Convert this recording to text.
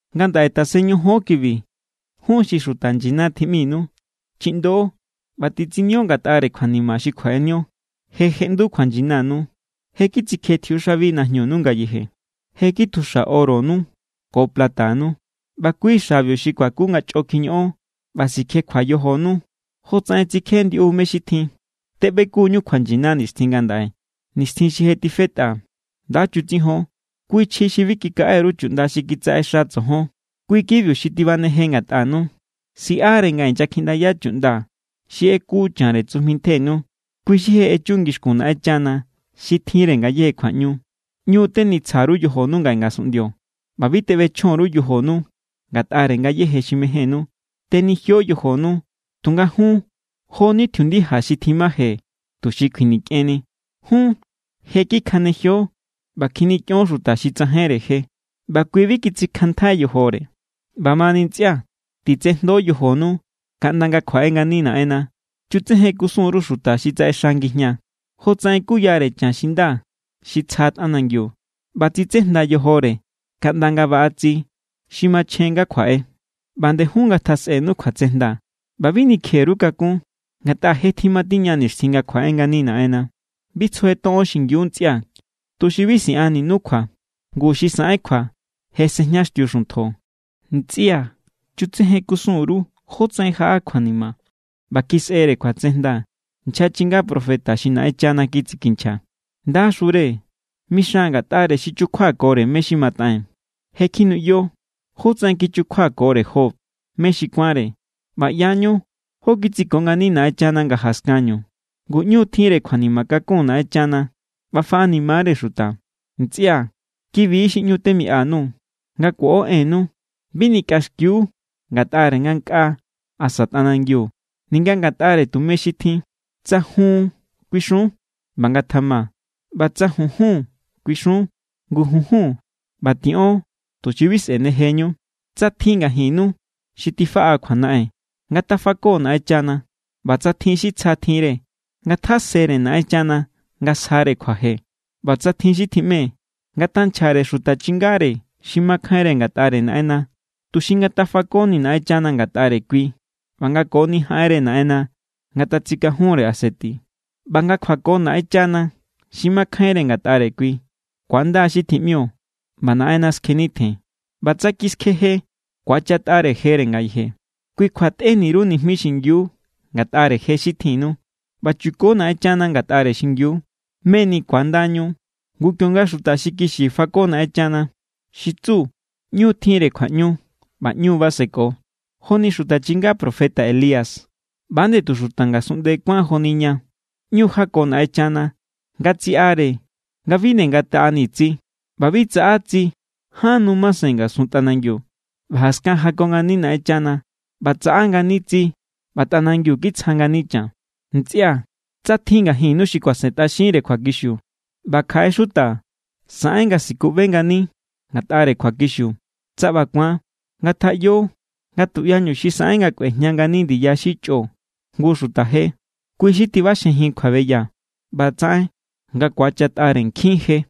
Ngandaꞌe tasen ñojon kibi jun xi xuta nyina tjiꞌminu, chiꞌndo ꞌba titsinio ngatꞌare kjuanima xi kjuaꞌenio. Je jeꞌndu kjuanyinanu. Je kitsikje tjiuxabi najñunu ngayeje. Je kitjuxa oronu ko platanu, ꞌba kui xa̱biu xi kuaku nga chꞌo kjiñoꞌon ꞌba sikjekjua yojonu jotsaꞌen tsikje ndiꞌu mé= xi tjin. Teꞌbekuñu kjuanyina nixtjin ngandaꞌe, nixtjin xi je tifetꞌa. Nda chutsijon kui chji xi bi kikaꞌe_ru chuꞌnda xi kitsaꞌexa tsojon, kui= kibiu xi tibaneje ngatꞌanu. Siꞌare nga inyakjiꞌndaya chuꞌnda xi ꞌeku chanre tsujmi ntjenu, kui xi je echu ngixkun Naꞌenchana xi tjinre ngayéje kjuaꞌñu. ꞌÑu tenitsja_ru yojonu ngaꞌe ngasunꞌndio ꞌba bi teꞌbechjon_ru yojonu ngatꞌare ngayéje xi mejénnu. Tenijio yojonu, tunga jun jo=ni tjiundija xi tjimaje tuxi kjuinikꞌenni. Jun je kikjanejio ꞌba kjinikꞌion xuta xi tsajainre je, ꞌba kui bi kitsikjanntjai yojore. ꞌBamani ntsꞌia̱, titsejndo yojonu kaꞌnda nga kjuaꞌe ngani Naꞌenna. Chutsejen kusun_ru xuta xi tsaꞌexa ngijñaa, jotsaꞌen kuyare chan xi nda xi tsja tꞌanangiu ꞌba tsitsejnda yojore kaꞌnda nga baꞌa tsi xi machjen nga kjuaꞌe. ꞌBa nde jun ngatjasꞌenu kjuatsejnda ꞌba bi nikje_ru kakún, ngatꞌa je tjimatiña nixtjin nga kjuaꞌe ngani Naꞌenna. Bi tsujetoꞌon xingiu, ntsꞌia̱, tuxi bi siꞌanninu kjua. Ngu xi saꞌen kjua je sejñaxtiu xuntjo. Ntsꞌia̱, chutsejen kusun_ru jótsaꞌen jaꞌa kjuanima ꞌba kisꞌere kjuatsejnda nchja chinga profeta xi Naꞌenchana kitsikinchja. ¡Ndaxure!, mixan ngatꞌare xi chukjuakore mé= xi mataꞌee̱n. Je kjinuꞌyo jótsaꞌen kichukjuakore Job mé xi kuánre, ꞌba ꞌyañu jó kitsiko ngani Naꞌenchana nga jaskanñu. Ngu ꞌñu= tjinre kjuanima kakun Naꞌenchana ꞌba faꞌanima=re xuta. Ntsꞌia̱, kibi= xi ꞌñu temiꞌa_nuu̱. Nga kuoꞌo ennu bi nikꞌaxkiu ngatꞌare ngankꞌaa asa tꞌanangiu, ninga ngatꞌare tume xi tjin. Tsa “jun” kuixun, ꞌba ngatjama. ꞌBa tsa “junjun” kuixun, ngu junjun. ꞌBa tiꞌon tuxi bi sꞌe̱nejeñu. Tsa tjin ngajinnu xi tifaꞌa kjuanaꞌen, ngatafako Naꞌenchana. ꞌBa tsa tjin xi tsja tjinre, ngatjasere Naꞌenchana nga sjare kjuaje. ꞌBa tsa tjin xi tjiꞌme, ngatanchjare xuta chingare xi makjainre ngatꞌare Naꞌenna, tuxi ngatafakoni Naꞌenchana ngatꞌare kui ꞌba nga koni jaꞌenre Naꞌenna ngatatsikajunre aseti. ꞌBa nga kjuako Naꞌenchana xi makjainre ngatꞌare kui, ku̱anda xi tjiꞌmio ꞌba Naꞌenna skjennitjen. ꞌBa tsa kiskjeje, ku̱achatꞌare jere ngayeje. Kui kjua tꞌeni_ru nijmi xingiu ngatꞌare je xi tjinnu, ꞌba chuko Naꞌenchana ngatꞌare xingiu, meni ku̱andañu. Ngu kionga xuta xi kixi fako Naꞌenchana, xi tsu ꞌñu= tjinre kjuaꞌñu ꞌba ꞌñu= baseko. Joni xuta chinga profeta Elías ꞌba=nde tu xuta ngasunꞌnde kuán joni ña. ꞌÑu jako Naꞌenchana nga tsiꞌare nga bi nde ngataꞌani tsi, ꞌba bi tsaꞌa tsi ján nu masen ngasun tꞌanangiu. ꞌBa jaskan jako ngani Naꞌenchana, ꞌba tsaꞌa ngani tsi ꞌba tꞌanangiu kitsja ngani chan. Ntsꞌia̱, tsa tjin ngajinnu xi kuasentꞌaxinre kjuakixiu ꞌba kjaꞌe xuta saꞌen nga sikuꞌbe ngani ngatꞌare kjuakixiu, tsa ꞌba ku̱an, ngatjaꞌyo nga tuꞌyañu xi saꞌen nga kꞌuejña ngani ndiya xi chꞌo jngu xuta je, kui xi tiꞌbaxjejin kjuabeya ꞌba tsaꞌen nga ku̱achatꞌare nkjin je.